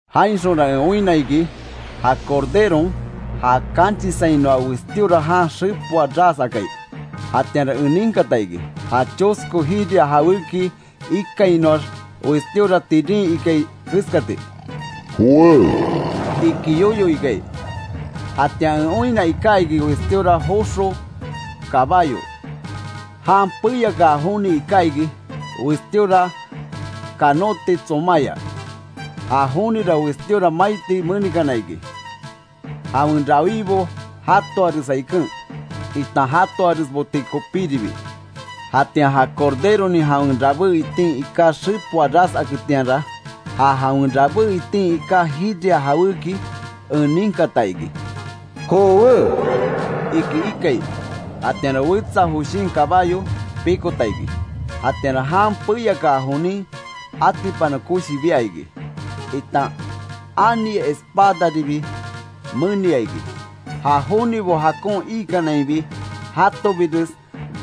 Jainxonra en oinna iki ja Corderon, ja kanchisainoa westíora jan xepoa ras akai. Jatianra en ninkata iki, ja chosko jiria jawéki ikainoax westíora tirin ikai keskati: “¡Jowé!” iki yoyo ikai. Jatian en oinna iká iki westíora joxo kabayo. Jan peyakaa joni iká iki, westíora kanóti tsomaya. Ja jonira westíora maiti menikana iki; jawen rawibo jatoaresa iken, itan jatoaresboti kopíribi. Jatian ja Corderonin jawen rabé itin iká xepoa ras aketianra, ja jawen rabé itin iká jiria jawéki en ninkata iki: “¡Jowé!” iki ikai. Jatianra wetsa joshin kabayo pikota iki. Jatianra jan peyakaa jonin, atipana koshi bia iki, itan ani espadaribi menia iki, ja jonibo jakon iikanainbi jatobires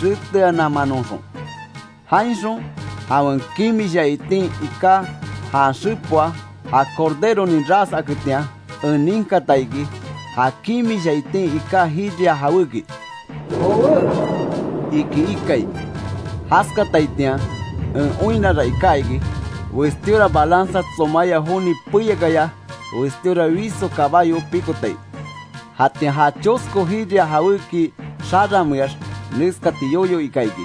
reteananmanoxon. Jainxon jawen kimisha itin iká jan xepoa, ja Corderonin ras aketian, en ninkata iki, ja kimisha itin iká jiria jawéki: “¡Jowé!” iki ikai. Jaskataitian en oinnara iká iki, westíora balanza tsomaya joni peyakaya westíora wiso kabayo pikotai. Jatian ja chosko jiria jawéki xarameax neskati yoyo ika iki: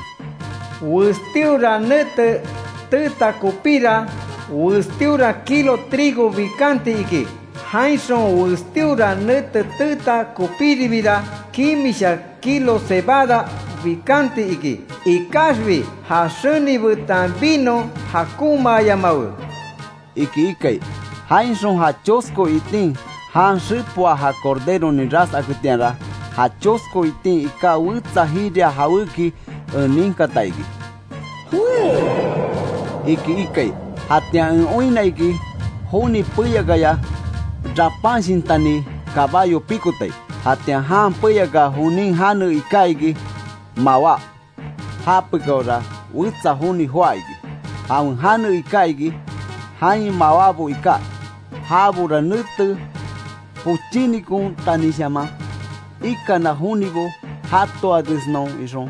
“Westíora nete teeta kopíra, westíora kilo trigo bikanti iki; jainxon westíora nete teeta kopíribira kimisha kilo cebada bikanti iki. Ikaxbi ja xeni betan vino jakonmaayamawe”, iki ikai. Jainxon ja chosko itin jan xepoa ja Corderonin ras aketianra, ja chosko itin iká wetsa jiria jawéki en ninkata iki: “¡Jowé!” iki ikai. Jatian en oinna iki joni peyakaya rapanshintani kabayo pikotai; jatian jan peyakaa jonin jane iká iki, Mawá. Já pekáora wetsa joni joá iki; jawen jane iká iki, jain mawábo iká, jabora nete pochínikontanishaman ikana jonibo jatoaresnon ixon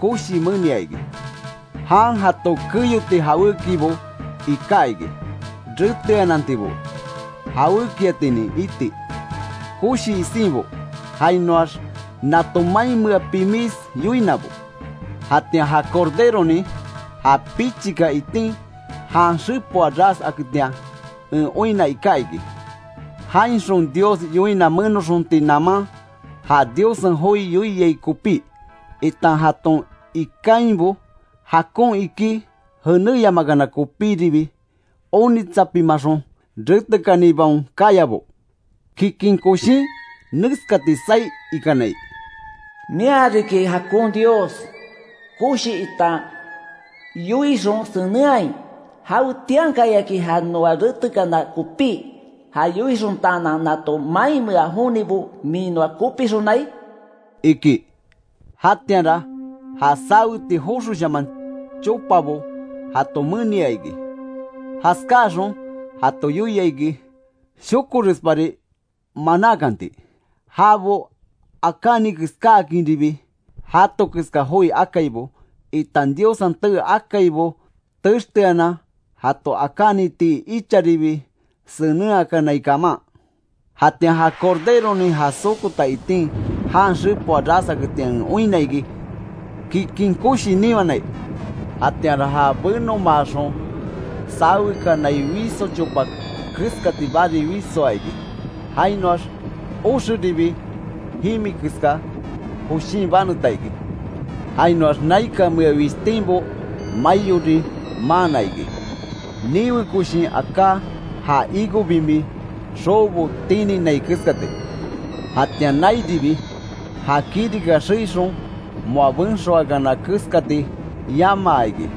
koshi menia iki. Jan jato keyoti jawékibo iká iki; reteanantibo, jawékiatinin iti, koshi isinbo, jainoax nato mainmea pimis yoinabo. Jatian ja Corderonin ja pichika itin jan xepoa ras aketian en oinna iká iki; jainxon Dios yoina menoxonti naman, ja Diossen joi yoiai kopí, itan jaton ikainbo jakon ikí jenéyamakana kopíribi onitsapimaxon retekanibaon kayabo, kikin koshin neskati saí ikanai: “Mia riki jakon Dios, koshi itan yoixon senenhai ¿Jawetiankayaki ja noa retekana kopí ja yoixontaanan, nato mainmea jonibo min noa kopixonai?” iki. Jatianra ja saweti joxoshaman chopabo jato menia iki. Jaskáxon jato yoia iki, shokorespari manakanti, jabo akáni keskáakinribi, jato keska joi akaibo, itan Diossen tee akaibo texteanan jato akánitii icharibi senenhakanai kaman. Jatian ja Corderonin ja sokota itin jan xepoa ras aketian en oinna iki, kikin koshi niwanai. Jatianra ja benomaaxon sawekanai wiso chopa keskati bari wisoa iki. Jainoax oxeribi jimi keska, joshín baneta iki. Jainoax naikanmea wishtinbo maiori maanna iki; niwe koshin aká ja higo bimi xoobo tininai keskati. Jatian nairibi, ja kirika xeixon moa benxoakana keskati yamaa iki.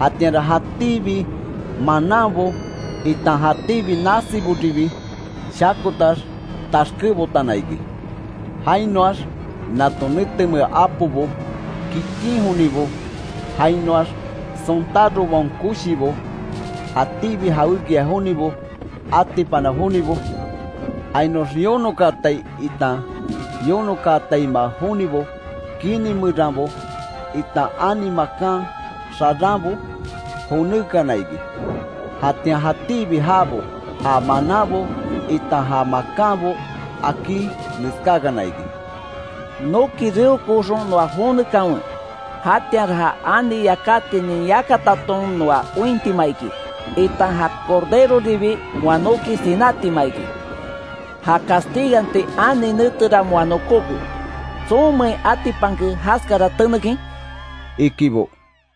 Jatianra jatíbi mananbo, itan jatíbi nasiboribi shakotax taxkebotana iki. Jainoax nato netemea apobo, kikin jonibo, jainoax sontárobaon koshibo, jatíbi jawékia jonibo, atipana jonibo; jainoax yonokaatai itan yonokaataima jonibo kini meranbo, itan ani makan xaranbo jonékana iki. Jatian jatíbi jabo, ja mananbo itan ja makanbo akí neskákana iki: “¡Noki reokooxon noa jonekanwe; jatianra ja ani yakatinin yakataton noa ointima iki, itan ja Corderoribi moa noki sinátima iki! Ja castiganti ani netera moa nokóke ¿Tsonmein atipanke jaskara tenekin?” ikibo.